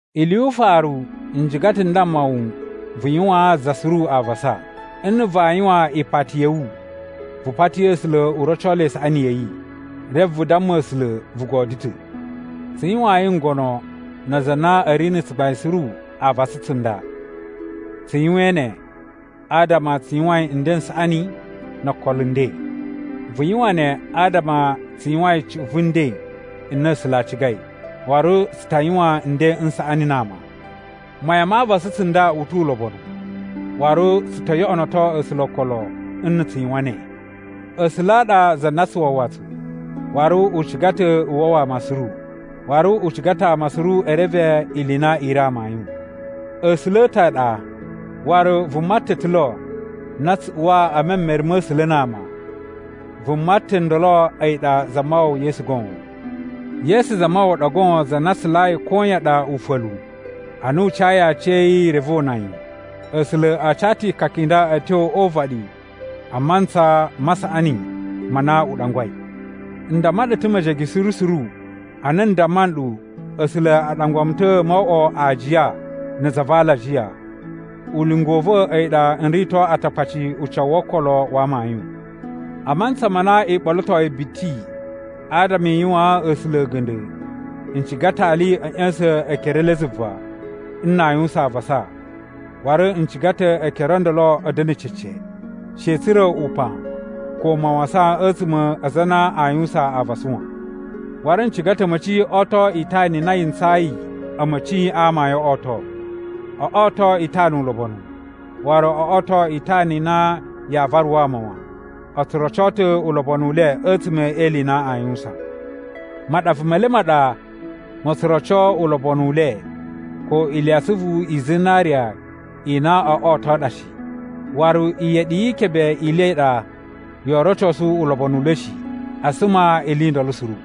Ili yu ufaru, n ciga ta̱ n damma wu vu yuwaan za suru avasa. Nna̱ vaa yuwan ipati ya̱ wu, vu pati A̱sula̱ u roco le isaꞌani ya̱ yi, reve vu damma A̱sula̱ vu godyo ta̱. Tsu yuwayin ngono na aza a na a̱ ri na̱ tsugbain suru avasa tsunda. Tsu yuwain ne adama tsu yuwain nden n saꞌani no okolo nden. Vu yuwan ne adama tsu yuwain cuꞌun vu nden n na A̱sula̱ a cigai, waru tsu ta yuwan nden n saꞌani na ama. Mayan ma avasa tsunda u tu ulobonu, waru tsu to yoꞌonoto A̱sula̱ okolo nna̱ tsu yuwan ne. A̱sula̱ a ɗa za na tsu wawa tsu, waru u ciga ta̱ u wawa ama suru. Waru u ciga ta̱ ama suru e reve ili i na i ri amayun. A̱sula̱ a̱ ta̱ a ɗa. Waru vuma ta̱ ta̱ lo na tsu uwa e memere ma̱ A̱sula̱ na ama. Vuma ta̱ ndolo a̱yi ɗa Zamawawa Yesu goon. Yesu Zamawawa ɗa goon za na tsulayi koyan ɗa ufa̱lu, ana u cayi aciya̱yi reve o una yi. A̱sula̱ a ca ta̱ ikaka i nda a̱ tyo o uvaɗi a mantsa ma saꞌani ma na u ɗangwai. N damma ɗu ta̱ mejege suru suru, ana n damma nɗu A̱sula̱ a ɗangwa mu ta̱ mo oꞌwo aajiya na̱ za va alajiya. Ulinga u va̱ a̱yi ɗa n rito Atakpaci ucawu wo okolo wa amayun. A mantsa ma na i ɓolotoi biti adama i yuwaan A̱sula̱ a̱ga̱nda̱ n ciga ta̱ ali a̱ ꞌya̱sa̱n ekere e le zuva, nna a yuwusan avasa, waru n ciga ta̱ ekere o ndolo a̱ da̱na̱ cece. She a̱ tsura̱ upan ko mawasan a̱tsuma̱ a aza a na aa yuwusan avasa wan. Waru n ciga ta̱ a̱ma̱ci o oto itana i na yi ntsayi a̱ma̱ci a amayun o oto. O oto itana ulobonu, waru o oto itana i na yaa varu ama wan. O tsu roco ta̱ ulobonu u le a̱tsuma̱ e ili i na aa yuwusan. Maɗava me le ma ɗa mo tso roco ulobonu u le ko iliyatsuvu i zinariya i na oo oto ɗa shi. Waru iyeɗi yi ikebe i le i ɗa yoo rocosu ulobonu u le shi. A suma ili i ndolo suru.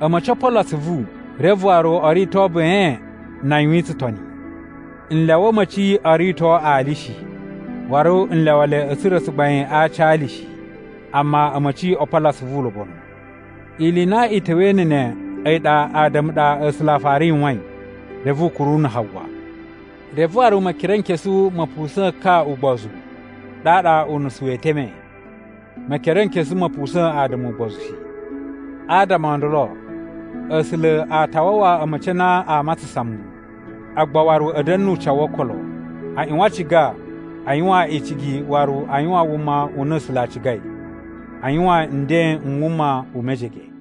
A̱ma̱ci o polo atsuvu reve waru o rito ben na a yuwin tsutoni. N lyawa a̱ma̱ci o rito ali shi, waru n lyawa le a̱ tsura̱ tsugbain a aci a ali shi. Amma a̱ma̱ci o polo atsuvu ulobonu. Ili i na i ta̱wa̱i na̱ ne a̱yi ɗa Ada̱mu ɗa A̱sula̱ a fara yuwain, reve u kuru na̱ Hawa. Reve waru Mekerenkesu ma̱ pusa̱a̱n ka ugbozu, ɗaɗa unusu wee teme. Mekerenkesu ma̱ pusa̱a̱n Ada̱mu ugbozu shi. Adama o ndolo, A̱sula̱ a ta wawa a̱ma̱ci ana aa matsasan muwun, agba waru a̱ da̱na̱ nu ucawu wo okolo. A ꞌyuwan a ciga a yuwan icigi waru a yuwan wuma u na A̱sula̱ a cigai. A yuwan nden n wuma u mejege.